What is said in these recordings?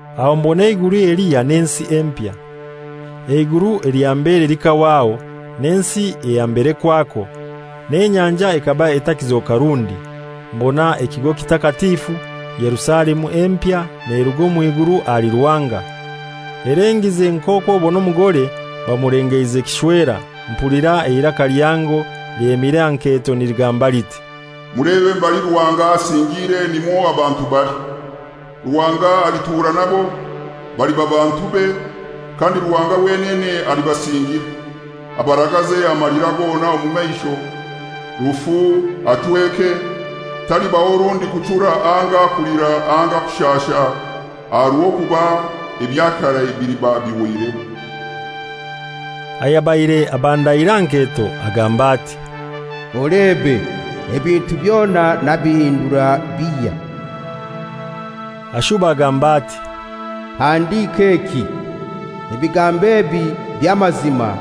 Aho mbona eiguru elihya n'ensi empya. Eiguru elya mbere likahwaho, n'ensi eya mbere kwakwo; n'enyanja ekaba etakizoka rundi. Mbona ekigo kitakatifu, Yerusalemu empya, neruga omw'iguru ahali Ruhanga, elengize nk'okw'obona omugore bamulengeize kishwera. Mpulira eiraka lihango lyemire aha nketo niligamba liti, «Mulebe mbali Ruhanga asingiire nimwo abantu bali. Ruhanga alitura nabo, baliba bantube, kandi Ruhanga wenene alibasingira, abaragaze amalira gona omu maisho, rufu achweke, talibaho rundi kuchura anga kulira anga kushasha, aha rw'okuba ebya karai biliba bihoireho.» Ayabaire abandaire aha nketo agamba ati, «Olebe ebintu byona nabihindura bihya.» Ashuba agamba ati, «Handika eki: Ebigambo ebi by'amazima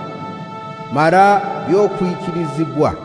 mara by'okwikilizibwa.»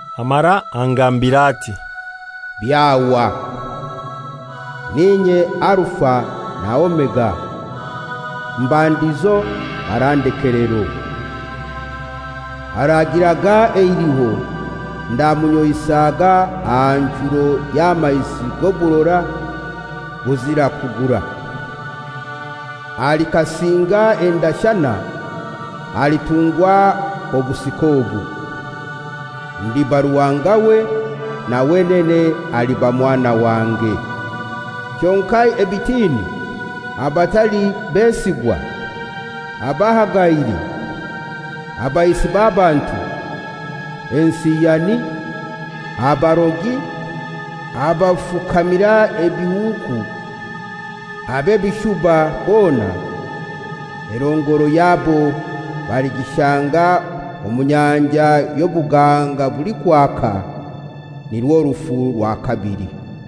Amara angambira ati, «Byahwa! N'inye Alufa na Omega, mbandizo mara ndekelero. Aragiraga eiliho ndamunyoisaga aha nchuro y'amaizi g'oburora obuzira kugura. Alikasinga endashana alitungwa obusika obu, ndiba Ruhanga we na wenene aliba mwana wange. Kyonka ebitini, abatali besigwa, abahagaire, abaisi b'abantu, ensiyani, abarogi, abafukamira ebihuuku, ab'ebishuba bona, erongoro yabo baligishanga omu nyanja y'obuganga bulikwaka, nirwo rufu rwa kabili.»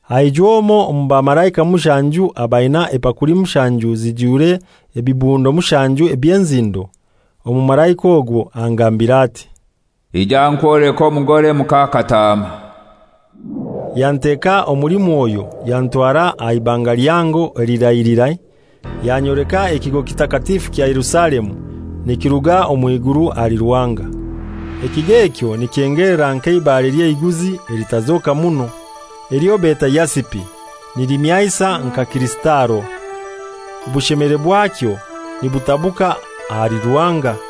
Aijwa omoi omu bamalaika mushanju abaina epakuli mushanju zijwire ebibundo mushanju eby'enzindo. Omumalaika ogwo angambira ati, «Ija nkwoleke omugore muka Kataama.» Yanteka omuli Mwoyo yantwara aha ibanga lihango eliralirai, yanyoleka ekigo kitakatifu kya Yerusalemu nikiruga omw'iguru ahali Ruhanga. Ekigo ekyo nikyengelera nk'eibare ly'eiguzi elitazoka muno, elyo beta yasipi, nilimyansa nka kirisitalo, obushemere bwakyo nibutabuka ahali Ruhanga.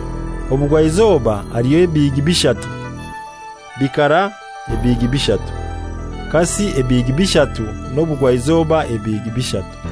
Obugwaizoba haliyo ebihigi bishatu, bikara ebihigi bishatu, kasi ebihigi bishatu, n'obugwaizoba ebihigi bishatu.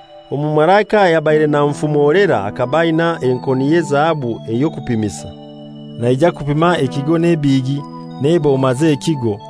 Omumalaika ayabaire nanfumolera akaba aina enkoni y'ezahabu ey'okupimisa, naija kupima ekigo n'ebihigi n'eboma z'ekigo.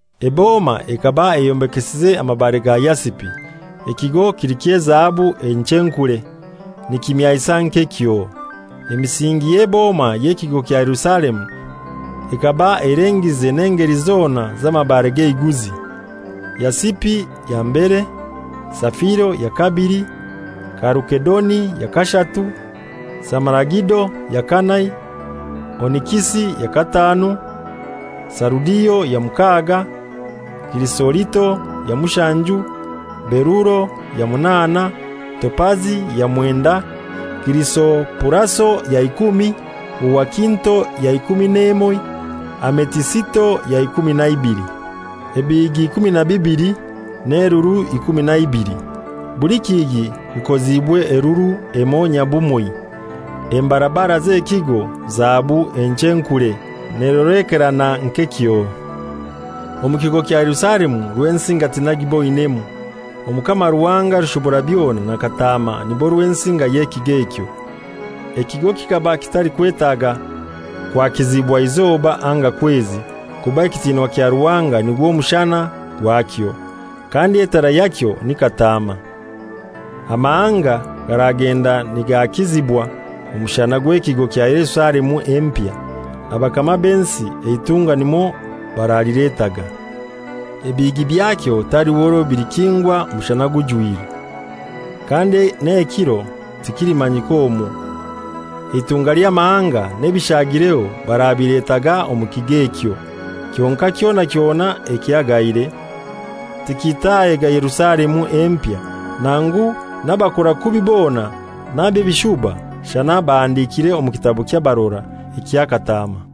Eboma ekaba eyombekesize amabare ga yasipi, ekigo kili ky'ezahabu enchenkure, nikimyansa nk'ekyoo. Emisingi y'eboma y'ekigo kya Yerusalemu ekaba elengize n'engeli zona z'amabare g'eiguzi. Yasipi ya mbere, safiro ya kabili, kalukedoni ya kashatu, samaragido ya kanai, onikisi ya kataanu, sarudio ya mukaaga, kirisorito ya mushanju, beruro ya munaana, topazi ya mwendai, kirisopuraso ya ikumi, huwakinto ya ikumi n'emoi, ametisito ya ikumi na ibili. Ebihigi ikumi na bibili n'elulu ikumi na ibili, buli kihigi kikoziibwe elulu emoi nyabumoi, embarabara z'ekigo zahabu enchenkure, n'erolekerana nk'ekyoo. Omu kigo kya Yerusalemu Rwensinga tinaigiboinemu. Omukama Ruhanga Rushoborabyona na Kataama nibo Rwensinga y'ekigo ekyo. Ekigo kikaba kitalikwetaga kwakizibwa izoba anga kwezi, kuba ekitinwa kya Ruhanga nigwo mushana gwakyo, kandi etara yakyo ni Kataama. Amahanga garagenda nigaakizibwa omushana gw'ekigo kya Yerusalemu empya. Abakama b'ensi eitunga nimwo baraliletaga. Ebihigi byakyo taliho orwo bilikingwa mushana gujwire, kandi n'ekiro tikilimanyika omwo. Eitunga ly'amahanga n'ebishaagireho barabiletaga omu kigo ekyo. Kyonkai kyona kyona ekihagaire tikitaahega Yerusalemu empya, nangu n'abakora kubi bona n'ab'ebishuba, shana abahandikire omu kitabo ky'abarora ekya Kataama.